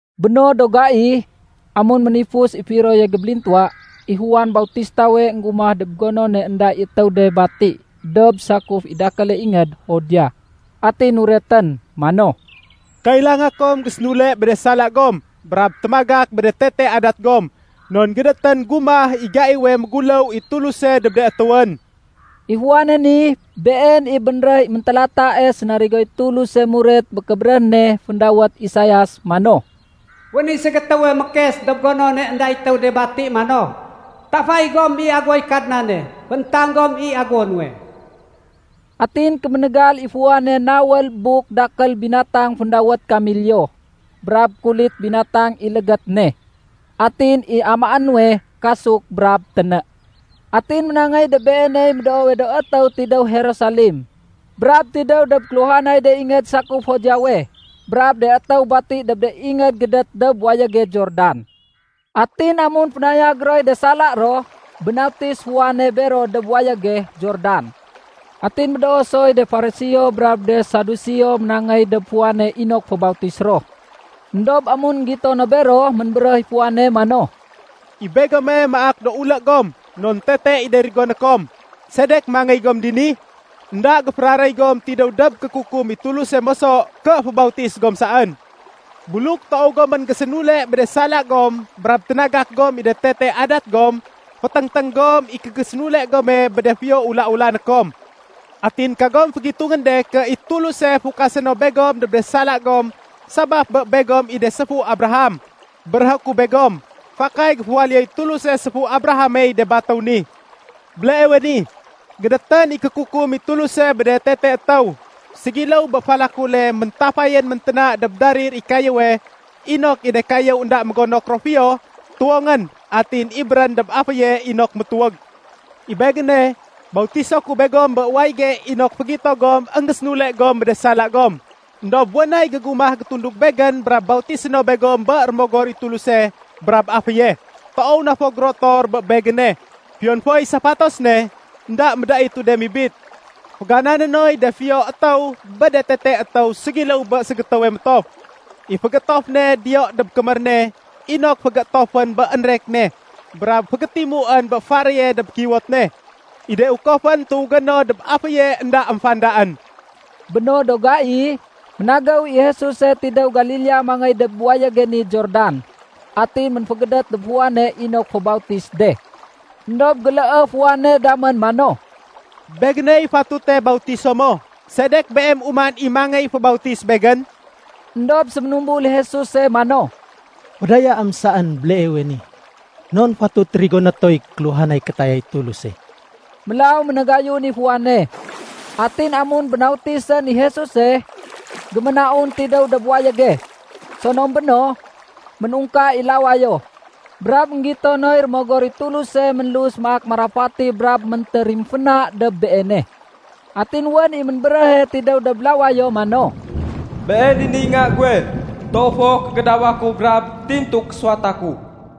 Bé no do gai, amun ménifus i firoye gébélintuwa, i Juan Bautistawe énggumah dob gonone énda i étéw de bati dob sakuf i dakéle ingéd Judea. Atin nuretén mano, “Kailanga kom gésénule bé de sala gom brab témagak bé de tete adat gom non gédétén gumah i gaiwe méguléw i Tuluse dob de étéwén.” I Juane ni, been i bénréh i méntélatae sénarigoy Tuluse muret bé kébéréh ne féndawét Isaias mano, “Wén i ségétéwe mékes dob gonone énda i étéw de bati mano, ‘Tafay gom i aguwoy Kadnane. Fééntang gom i aguwo nuwe.’” Atin kéménégal i Juane nawél buk dakél binatang féndawét kameliyo, brab kulit binatang i légét ne. Atin i amaé nuwe kasuk brab téné. Atin ménangéy dob beeney médoowe do étéw tidéw Jerusalem, brab tidéw dob kéluhanay de ingéd sakuf Judeawe, brab de étéw bati dob de ingéd gédét dob wayége Jordan. Atin amun fénayag roy de sala ro, bénautis Juane bero dob wayége Jordan. Atin médoo soy de Fariseo brab de Saduseo ménangéy dob Juane inok fébautis ro. Endob amun énggito no bero, ménbéréh i Juane mano, “I begome maak do ulé gom non tete i de rigoné kom. Sedek mangéy gom dini? Enda géféraréy gom tidéw dob kékukum i Tuluse moso ké fébautis gom saén. Buluk toow gomén gésénule bé de sala gom brab ténagak gom i de tete adat gom, féténgténg gom i kégésénule gome bé de fiyo ula-ulané kom. Atin kagom fégitungén de ké i Tuluse fukasé no begom dob de sala gom sabaf bé begom i de séfu Abraham. Béréhé ku begom, fakay géféwaléyoy Tuluse séfu Abrahamey de batéw ni. Béleewe ni, gédétén i kékukum i Tuluse bé de tete étéw. Ségiléw bé falakule méntafayén ménténa dob darir i kayéwe inok i de kayéw énda mégonok ro fiyo, tuwongén atin ibérén dob aféye inok métuwég. I begéne, bautiso ku begom bé wayége inok fégito gom énggésénule gom bé de sala gom. Endob wén nay gégumah gétundug begén brab bautisé no begom bé Rémogor i Tuluse brab aféye. Toow na fo gérotor bé begéne. Fiyon foy safatos ne, énda médaitu de mibit. Féganané noy de fiyo étéw bé de tete étéw ségiléw bé ségétéwe métof. I fégéétof ne diyo dob kémér ne inok fégéétofén bé énrek ne brab fégétimuén bé faréye dob kiwot ne. I de ukofén tuwégé no dob aféye énda émfandaén.” Bé no do gai, ménagéw i Jesuse tidéw Galilea mangéy dob wayége ni Jordan. Atin ménfégédét dob Juane inok fébautis de. Endob géléé Juane damén mano, “Begéney fatute bautiso mo, sedek Beem uman i mangéy fébautis begén?” Endob séménumbul i Jesuse mano, “Fédayaém saén béleewe ni. Non fatut rigoné toy kéluhanay kétayay Tuluse.” Mélaw ménagayun i Juane. Atin amun ménbautisén i Jesuse, géménaun tidéw dob wayége. Sonom béno, ménungka i lawayo, brab énggito noy Rémogor i Tuluse ménlus maak marafati brab méntérimféna dob Beene. Atin wén i ménbéréhe tidéw dob lawayo mano, “Been i niy Nga guwe. Toow fo kégédawa ku brab tintu késuwata ku.”